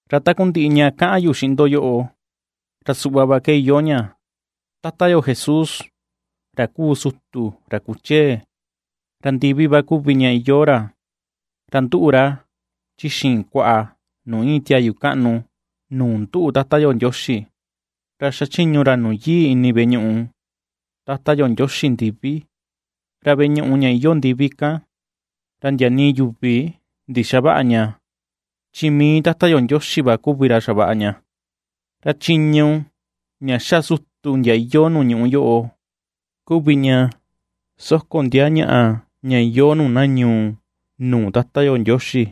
Ra takundiꞌi ña kaꞌan yu xiꞌin ndo yoꞌo, ra suꞌva va ke iyoo ña: Tata yo Jesús, ra kuu sutu, ra kuchee, ra ndivi va kuvi ña iyoo ra, ra nduꞌu ra chi xiin kuaꞌa nuu iin tiayu kaꞌnu nuu nduꞌu Tata yo Ndioxi. Ra xachiñu ra nuu yii ini veꞌe ñuꞌu Tata yo Ndioxi ndivi. Ra veꞌe ñuꞌu ña iyoo ndivi kan, ra ndia nii yuvi ndixaväꞌa ña, chi mii va Tata yo Ndioxi va kuvi ra xavaꞌa ña. Ra chiñu ña xa sutu ndia iyoo nuu ñuꞌú yoꞌo kuvi ña soko ndia ñaꞌa ña iyoo nuu na ñuu nuu Tata yo Ndioxi,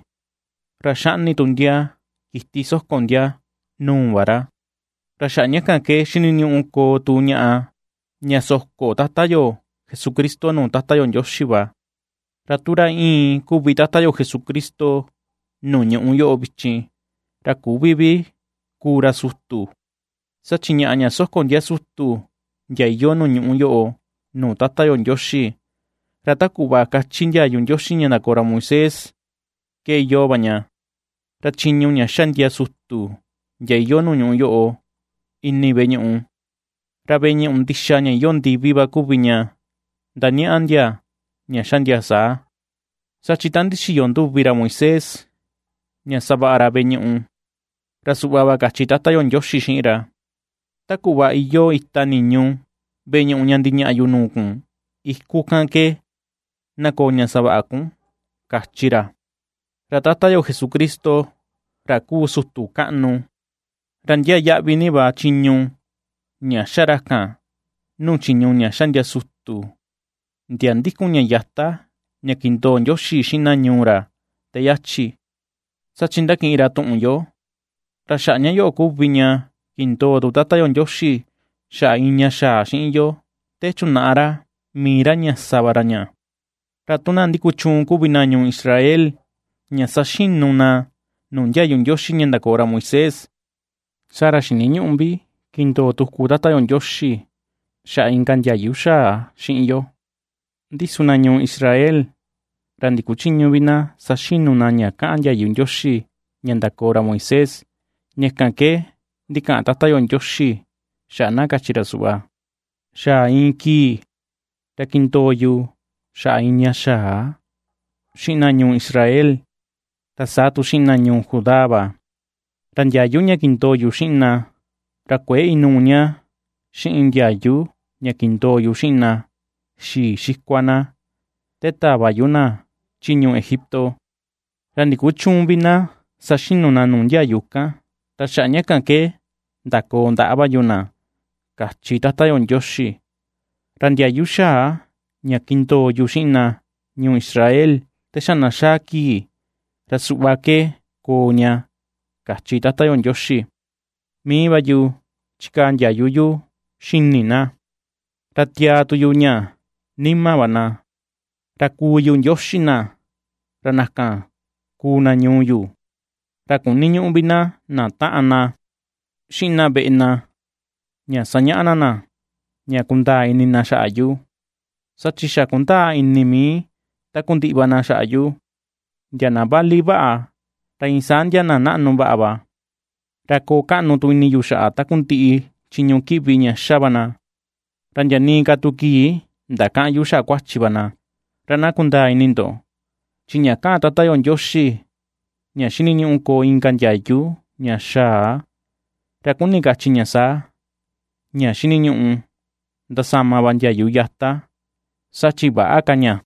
ra xaꞌni tu ndia kiti soko ndia nuu va ra. Ra xaꞌa ña ke xiniñuꞌu koo tu ñaꞌa ña soko Tata yo Jesucristo nuu Tata yo Ndioxi va. Ra tu ra íin kuvi Tata yo Jesucristo nuu ñuꞌú yoꞌo vichin, ra küvi vi kuu ra sutu, saa chi ñaꞌa ña soko ndia sutu ndia iyoo nuu ñuꞌú yoꞌo nuu Tata yo Ndioxi, ra ta kuꞌva kachi ndiayu Ndioxi ña ndakoo ra Moisés ke iyoo va ña. Ra chiñu ña xa ndia sutu ndia iyoo nuu ñuꞌú yoꞌo ini veꞌe ñuꞌu, ra veꞌe ñuꞌu ndixa ña iyoo ndivi va kuvi ña ndañaꞌa ndia ña xa ndia saa. Saa chi ta ndixiyo nduvi ra Moisés ña savaꞌa ra veꞌe ñuꞌu, ra suꞌva va kachi Tata yo Ndioxi xiꞌin ra: “Ta kuꞌva iyoo ita niñu veꞌe ñuꞌu ña ndiñaꞌa yu nuu kun iku kan ke na koo ña savaꞌa va kun”, kachi ra. Ra Tata yo Jesucristo ra kuu sutu kaꞌnu, ra ndiaa yaꞌvi ni va chiñu ña ^xa ra kan nuu chiñu ña ^xa sutu ndia ndikun ña yata ña kindoo Ndioxi xiꞌin na ñuu ra te yachi, saa chi ndakiꞌin ra tuꞌun yo, ra xaꞌa ña yoꞌo kuvi ña kindoo tu Tata yo Ndioxi xaꞌa iin ña xaa xiꞌin yo, te chunaꞌa ra mii ra ña sa va ra ña. Ra tu na ndikuchuun kuvi na ñuu Israel ña saxinu na nuu ndiayu Ndioxi ña ndakoo ra Moisés, saa ra xiniñüꞌu vi kindoo tuku Tata yo Ndioxi xaꞌa inka ndiayu xaa xiꞌin yo. Ndi su na ñuu Israel, ra ndikuchïñu vi na saxinu na ña kaꞌan ndiayu Ndioxi ña ndakoo ra Moisés, ña kan ke ndikaꞌan Tata yo Ndioxi xaꞌa na kachi ra suꞌva: Xaa iin kii ra kindoo yu xaꞌa iin ña xaa xiꞌin na ñuu Israel, ra saa tu xiꞌin na ñuu Judá va. Ra ndiayu ña kindoo yu xiꞌin na, ra kuëe inuu ña xiꞌin ndiayu ña kindoo yu xiꞌin na xii xikua na te tava yu na chi ñuu Egipto; ra ndikuchüun vi na saxinu na nuu ndiayu kan, ra xaꞌa ña kan ke ndakoo ndaꞌa va yu na, kachi Tata yo Ndioxi. Ra ndiayu xaa ña kindoo yu xiꞌin na ñuu Israel te xa na xaa kii, ra suꞌva ke koo ña, kachi Tata yo Ndioxi: Mii va yu chikaa ndiayu yu xini na, ra tiaa tu yu ña nima va na. Ra kuu yu Ndioxi na, ra na kan kuu na ñuu yu. Ra kuniñüꞌu vi na na taꞌan na, xiꞌin na veꞌe na, ña sañaꞌa na na, ña kundaa ini xaꞌa yu, saa chi xa kundaa ini mii takundiꞌi va na xaꞌa yu, ndia na vali vaꞌa, ra iin saa ndia na naꞌnu vaꞌa va. Ra koo kaꞌnu tu ini yu xaꞌa takundiꞌi chiñu kiꞌvi ña xa va na, ra ndia nii ka tu kii ndakäꞌan yu xaꞌa kuachi va na. Ra na kundaa ini ndo, chi ña kaꞌan Tata yo Ndioxi ña xiniñuꞌu koo inka ndiayu ña xaa, ra kuni kachi ña saa, ña xiniñuꞌu ndasama va ndiayu yata, saa chi väꞌa ka ña.